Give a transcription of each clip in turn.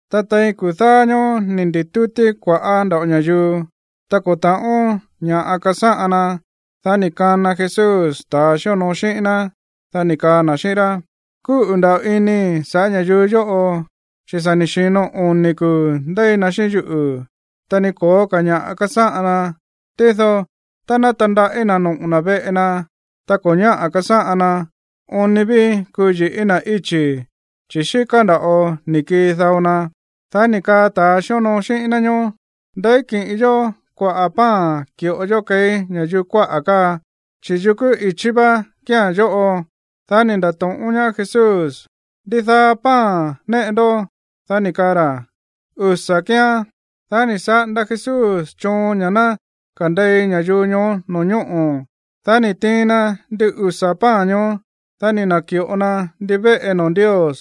Ta tein kuu̱ dáá ñóó ni̱ ndi̱tútí kua̱ꞌá nda̱ꞌo ña̱yuu. Ta ko̱ ta̱ꞌón ña̱ꞌa kasáꞌan na. Dá ni̱ kana Jesús ta̱a xíonoo xíꞌín ná. Dá ni̱ kaa na̱ xíꞌín rá: ―Kúꞌu̱ nda̱ꞌo inii̱ sa̱ꞌá ña̱yuu yóꞌo, chi̱ sa̱ ni̱ xi̱no oni̱ kuu̱ ndéi na xíꞌín yuꞌu̱, ta ni ko̱ó ka̱ ña̱ꞌa kasáꞌan ná. Tído tá ná tandaꞌí na̱ noꞌo̱ na̱ veꞌe na tá ko̱ ñáꞌa̱ kasáꞌan na, oon ni ví kuu yi̱ꞌí na̱ íchi̱, chi̱ xíká nda̱ꞌo ni̱ kii dao na. Dá ni̱ kaa ta̱ xíonoo xíꞌín ná ñoó: ―¿Ndeí kiꞌin yó kua̱ꞌá pan ki̱ꞌo yó keí ña̱yuu kuaꞌa̱ káa, chi̱ yukú ichí vá kía̱n yóꞌo? Dá ni̱ nda̱to̱ꞌón ñaá Jesús: ―¿Ndidaá pan néꞌe ndó? Dá ni̱ kaa ra̱: ―Usa̱ kíán. Dá ni̱ saꞌanda Jesús choon ña̱ ná kande̱i ña̱yuu ñoó no̱ñóꞌo̱. Dá ni̱ tiin na ndin usa̱ pan ñoó. Dá ni̱ na̱ki̱ꞌo na ndivéꞌe noo̱ Ndios.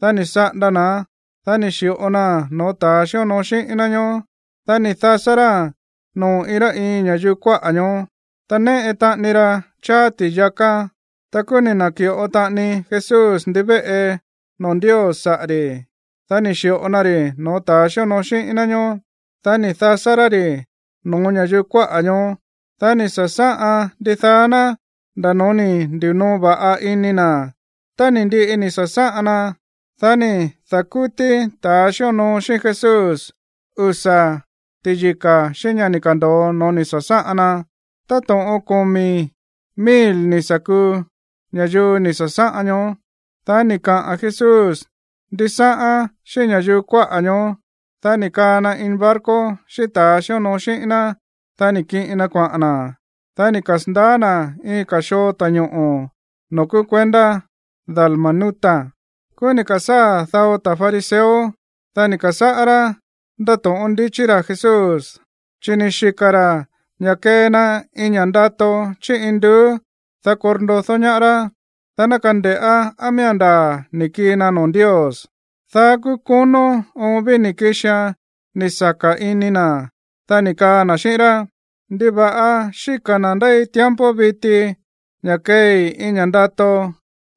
Dá ni̱ saꞌanda na̱án. Dá ni̱ xi̱ꞌo naa̱n no̱ó ta̱ xíonoo xíꞌín ná ñóó. Dá ni̱ dasá ráa̱n noo̱ iin rá iin ña̱yuu kuáꞌa̱ ñoó. Ta néꞌe taꞌani ra cháá ti̱yaká. Ta kúú ni̱ na̱ki̱ꞌo taꞌani Jesús ndivéꞌe noo̱ Ndios saꞌa̱ ri̱. Dá ni̱ xi̱ꞌo na ri̱ no̱ó ta̱ xíonoo xíꞌín ná ñóó. Dá ni̱ dasá rá ri̱ no̱ó ña̱yuu kuáꞌa̱ ñoó. Dá ni̱ sa̱sáꞌan ndidaá ná nda̱ no̱ó ni̱ ndi̱noo va̱ꞌa ini na̱. Tá ni̱ ndiꞌi ni̱ sa̱sáꞌan na, dá ni̱ da̱kútí ta̱ xíonoo xíꞌín Jesús usa̱ ti̱yika̱ xíꞌín ña̱ ni̱ ka̱ndo̱o no̱ó ni̱ sa̱sáꞌan na. Táto̱ꞌon komi̱ mil ni̱ sa̱ kuu ña̱yuu ni̱ sa̱sáꞌan ñoó. Dá ni̱ kaꞌa̱n Jesús ndisáꞌán xíꞌín ña̱yuu kuáꞌa̱ ñoó. Dá ni̱ kaa na ini barco xíꞌín ta̱a xíonoo xíꞌín ná. Dá ni̱ kiꞌin na kuaꞌa̱n na̱. Dá ni̱ kasa̱ndaá na̱ iin ka̱ xoo ta̱ñoꞌo̱ noo̱ kúú kuendá Dalmanuta. Kúú ni̱ ka̱sáa̱ dao ta̱ fariseo. Dá ni̱ ka̱sáꞌá rá ndátóꞌón ndichí ra̱ Jesús, chi̱ ni̱ xika̱ ra̱ ña̱ kee na iin ña̱ ndato chí induú, dá korndodó ñaá rá, dá ná kande̱ꞌá á miía̱n ndaa̱ ni̱ kii na noo̱ Ndios. Dá kúú konó oon ví ni̱ kixia̱n ni̱ saka̱ ini na̱. Dá ni̱ kaa na̱ xíꞌín rá: ―¿Ndiva̱ꞌa xíka̱ na̱ ndéi tiempo viti ña̱ keei iin ña̱ ndato?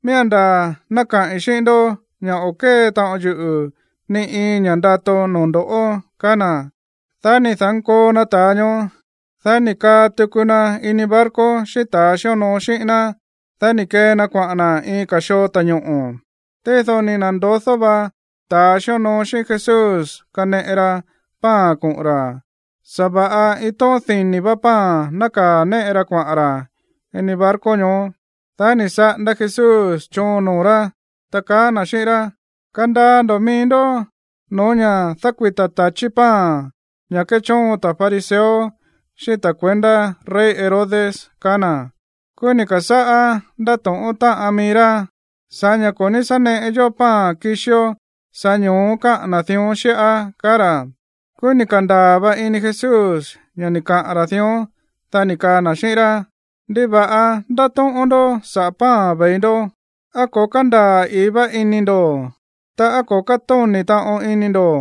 Miía̱n ndaa̱ ná kaꞌi̱n xíꞌín ndó ña̱ o̱ kée taꞌon yuꞌu̱ ni iin ña̱ ndato no̱ó ndo̱ꞌó ―kaá na̱. Dá ni̱ da̱nkoo na ta̱a ñoó, dá ni̱ kaa tuku na ini barco xíꞌín ta̱ xíonoo xíꞌín ná. Dá ni̱ kee na kuaꞌa̱n na̱ iin ka̱ xoo ta̱ñoꞌo̱. Tído ni̱ na̱ndodó vá ta̱ xíonoo xíꞌín Jesús kaneꞌe ra pan koꞌo̱n ra̱. Sa̱va̱ꞌa iin tóꞌón dini̱ vá pan nákaa̱ néꞌe ra kuaꞌa̱n ra̱ ini barco ñoó. Dá ni̱ saꞌanda Jesús choon noo̱ rá, ta kaá na̱ xíꞌín rá: ―Kandaa ndo̱ mií ndó xíꞌín ña̱ dákuita̱ ta̱chí pan, ña̱ kéchóon ta̱ fariseo xíꞌín ta̱ kuendá rey Herodes ―kaá na̱. Kúú ni̱ ka̱sáꞌá ndátóꞌón táꞌan mií rá: ―Sa̱ꞌá ña̱ ko̱ ní sá neꞌe yó pan kixió, sa̱ꞌá ño̱ó káꞌa̱n na̱ dión xíꞌá ―kaá ra̱. Kúú ni̱ ka̱ndaa̱ va ini Jesús ña̱ ni̱ kaꞌa̱n ra̱ dión. Dá ni̱ kaa na̱ xíꞌín rá: ―¿Ndiva̱ꞌa ndátóꞌón ndó saꞌa̱ pan ve̱i ndó? ¿Á ko̱ kándaa̱ i̱í vá ini ndo̱, ta á ko̱ kátóni̱ taꞌon ini ndo̱?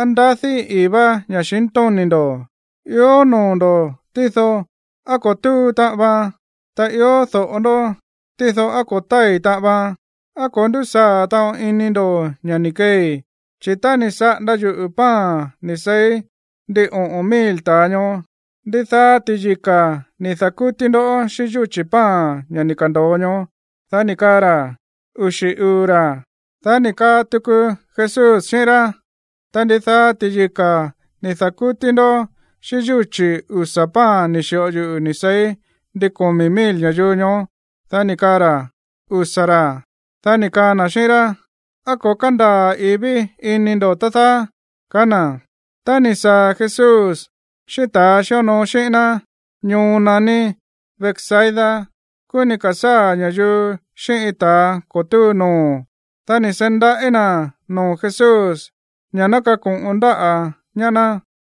¿Á ndadí i̱í vá ña̱xintóni̱ ndo̱? Ió noo̱ ndo̱, tído, ¿á ko̱ túu taꞌan vaan? Ta ió do̱ꞌo ndó, tído, ¿á ko̱ tái̱ taꞌan vaan? ¿Á ko̱ ndúsaa̱ taꞌon ini ndo̱ ña̱ ni̱ keei? Chi̱ tá ni̱ saꞌanda yuꞌu̱ pan ni̱ seí ndin oꞌo̱n mil ta̱a ñoó, ¿ndidaá ti̱yika̱ ni̱ da̱kútí ndó xíꞌín yúchi̱ pan ña̱ ni̱ ka̱ndo̱o ñoó? Dá ni̱ kaa ra̱: ―Uxi̱ uu̱ ra̱. Dá ni̱ kaa tuku Jesús xíꞌín rá: ―Ta, ¿ndidaá ti̱yika̱ ni̱ da̱kútí ndó xíꞌín yúchi̱ usa̱ pan ni̱ xi̱ꞌo yuꞌu̱ ni̱ seí ndin komi̱ mil ña̱yuu ñoó? Dá ni̱ kaa ra̱: ―Usa̱ ra̱. Dá ni̱ kaa na̱ xíꞌín rá: ―¿Á ko̱ kándaa̱ i̱í ví ini ndo̱, tá dáá? ―kaá na̱. Tá ni̱ saa̱ Jesús xíꞌín ta̱a xíonoo xíꞌín ná ñoo naní Betsaida, kúú ni̱ ka̱sáa̱ ña̱yuu xíꞌín iin ta̱a ko̱ túu noo̱. Dá ni̱ seí ndaꞌí na̱ noo̱ Jesús ña̱ ná kako̱ꞌon ndáꞌa̱ ñaá ná.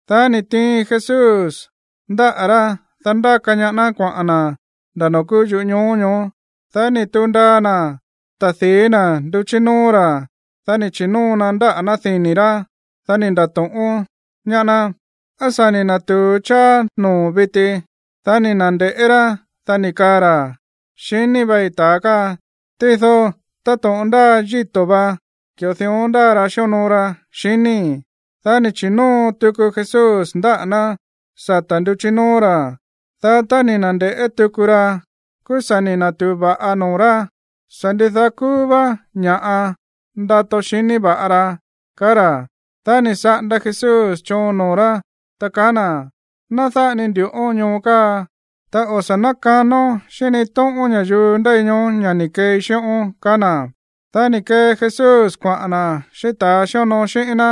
Dá ni̱ tiin Jesús ndáꞌa̱ rá, dá ndáka ñaá ná kuaꞌa̱n na̱ nda̱ noo̱ kúú yuꞌú ñoo ñoó. Dá ni̱ tu̱u ndaa na̱ ta̱di̱í na̱ nduchí nóó ra̱. Dá ni̱ chi̱nóo na ndáꞌa̱ ná dini̱ rá. Dá ni̱ nda̱to̱ꞌón ñaá ná: ―¿Á sa̱ ni̱ na̱tu̱u cháá noo̱o̱n viti? Dá ni̱ na̱nde̱ꞌé rá, dá ni̱ kaa ra̱: ―Xiní vai ta̱a káa, tído táto̱ꞌon ndáa yíto̱ vá, ki̱ꞌo dión ndáa ra xíonoo ra, xiníi̱. Dá ni̱ chi̱nóo tuku Jesús ndáꞌa̱ ná sata̱ nduchí nóó ra̱. Dá tá ni̱ na̱nde̱ꞌé tuku ra, kúú sa̱ ni̱ na̱tu̱u va̱ꞌa noo̱ rá. Sa̱ ndidaá kúú vá ña̱ꞌa ndato xiní va̱ꞌa ra, kaá ra̱. Dá ni̱ saꞌanda Jesús choon noo̱ rá, ta kaá na̱: ―Ná dáꞌa ni ndu̱ꞌón ñoo káa, ta o̱ sa̱ nákanón xíꞌín ni iin tóꞌón ña̱yuu ndéi ñoó ña̱ ni̱ keei xíꞌón ―kaá na̱. Dá ni̱ kee Jesús kuaꞌa̱n na̱ xíꞌín ta̱a xíonoo xíꞌín ná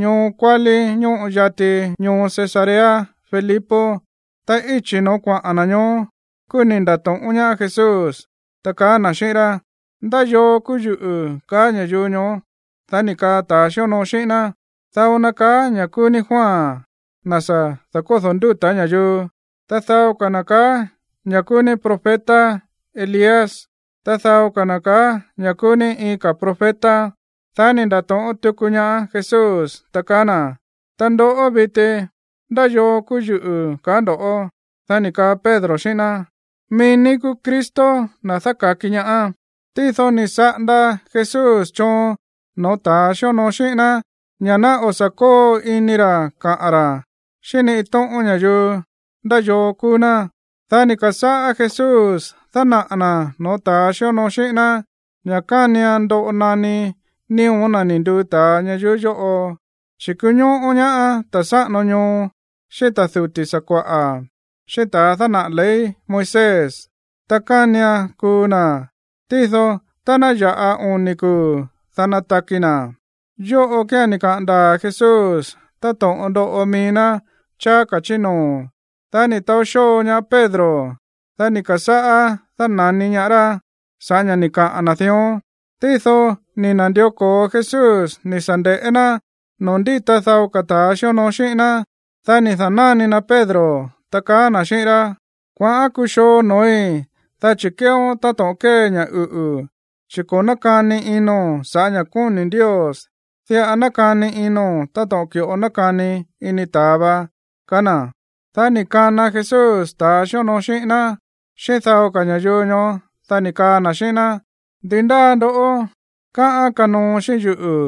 ñoo kuálí ñóꞌo yati ñoo Cesarea Filipo. Ta íchi̱ no̱ó kuaꞌa̱n na̱ ñoó, kúú ni̱ nda̱to̱ꞌón ñaá Jesús, ta kaá na̱ xíꞌín rá: ―¿Ndá yoo kúú yuꞌu̱, kaá ña̱yuu ñoó? Dá ni̱ kaa ta̱ xíonoo xíꞌín ná: ―Dao na̱ kaá ña̱ kúú ní Juan, na̱ sa̱ da̱kódo̱ ndúta̱ ña̱yuu. Ta dao ka̱ na̱ ka̱á ña̱ kúú ní profeta Elías. Ta dao ka̱ na̱ ka̱á ña̱ kúú ní iin ka̱ profeta. Dá ni̱ nda̱to̱ꞌón tuku ñaá Jesús, ta kaá na̱: ―Ta ndoꞌó viti, ¿ndá yoo kúú yuꞌu̱, kaá ndo̱ꞌó? Dá ni̱ kaa Pedro xíꞌín ná: ―Mií ní kúú Cristo, na̱ dáka̱ki ñaá. Tído ni̱ saꞌanda Jesús choon no̱ó ta̱ xíonoo xíꞌín ná ña̱ ná o̱ sa̱ kóo ini ra̱ kaꞌa̱n ra̱ xíꞌín ni iin tóꞌón ña̱yuu ndá yoo kúú ná. Dá ni̱ ka̱sáꞌá Jesús dánaꞌa̱ na̱ no̱ó ta̱ xíonoo xíꞌín ná ña̱ kánian ndoꞌo naní nío̱ na̱ ni̱ nduu ta̱a ñayuú yóꞌo, chi̱ kuñóꞌó ñaá ta̱ sáꞌano ñoo, xíꞌín ta̱ duti̱ sakua̱ꞌa̱, xíꞌín ta̱a dánaꞌa̱ ley Moisés, ta kánian kuu na̱. Tído tá ná ya̱ꞌa oni̱ kuu̱, dá nataki na̱. Yóꞌo kía̱n ni̱ kaꞌa̱n ndaa̱ Jesús táto̱ꞌon ndoꞌo mií ná cháá ka̱ chí noo̱. Dá ni̱ taó xóo ñaá Pedro. Dá ni̱ ka̱sáꞌá dána̱ni ñaá rá sa̱ꞌá ña̱ ni̱ kaꞌa̱n na̱ dión. Tído ni̱ na̱ndió ko̱o Jesús ni̱ sa̱ nde̱ꞌé ná noo̱ ndíta dao ka̱ ta̱ xíonoo xíꞌín ná. Dá ni̱ da̱náni na Pedro, ta kaá na̱ xíꞌín rá: ―Kuaꞌán kuxoo noo̱í, dá chi̱ kéeón táto̱ꞌon kée ña̱ uꞌu̱, chi̱ ko̱ nákani ino̱n sa̱ꞌá ña̱ kóni̱ Ndios, diꞌa nákani ino̱n táto̱ꞌon ki̱ꞌo nákani ini ta̱a va ―kaá na̱. Dá ni̱ kana Jesús ta̱a xíonoo xíꞌín ná, xíꞌín dao ka̱ ña̱yuu ñoó, dá ni̱ kaa na̱ xíꞌín ná: ―Ndi ndáa ndo̱ꞌó káꞌán kanoo xíꞌín yuꞌu̱,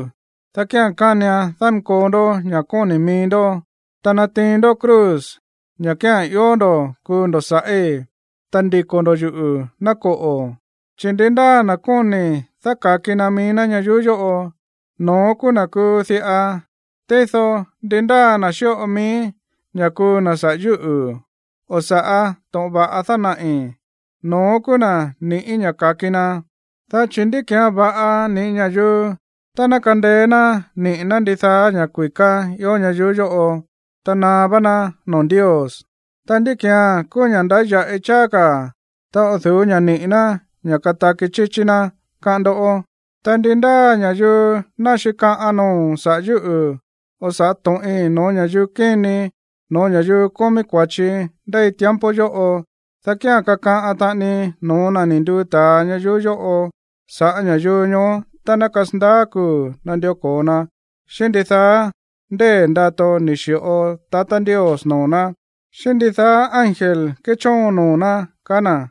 dá kía̱n kánian dánkoo ndó ña̱ kóni̱ mií ndó, ta natiin ndó cruz, ña̱ kía̱n ió ndo̱ kuu ndo̱ sa̱ꞌí, ta ndiko̱ ndo̱ yuꞌu̱, ná koꞌo̱. Chi̱ ndi ndáa na̱ kóni̱ dáka̱ki na mií ná ñayuú yóꞌo, no̱ón kúú na̱ kuu diꞌa. Tído ndi ndáa na̱ xíꞌo mií ña̱ kuu na̱ saꞌa̱ yúꞌu̱, o saꞌa̱ to̱ꞌon va̱ꞌa dánaꞌi̱, no̱ón kúú na̱ niꞌi̱ ña̱ ka̱ki na. Dá chi̱, ¿ndi ki̱án va̱ꞌa niꞌi̱ ña̱yuu tá ná kandeé ná niꞌi̱ ná ndidaá ña̱ kui̱ká ió ñayuú yóꞌo, ta naá vá ná noo̱ Ndios? Ta, ¿ndí ki̱án kúú ña̱ꞌa ndáya̱ꞌi cháá ka̱ tá o̱ du̱ú ña̱ niꞌi̱ ná ña̱ kataki chíchí ná, káꞌán ndó? ’Ta ndi ndáa ña̱yuu ná xíkaꞌan noo̱ sa̱ꞌá yuꞌu̱ o sa̱ꞌá to̱ꞌin no̱ó ña̱yuu kini, no̱ó ña̱yuu kómí kua̱chi ndéi tiempo yóꞌo, dá kía̱n kakaꞌan taꞌani no̱ó na̱ ni̱ nduu ta̱a ñayuú yóꞌo saꞌa̱ ña̱yuu ñoó tá ná kasandaá kuu̱ nandió ko̱o na xíꞌín ndidaá ndée̱ ndato ni̱ xi̱ꞌo tatá Ndios noo̱ ná, xíꞌín ndidaá ángel kéchóon noo̱ ná ―kaá na̱.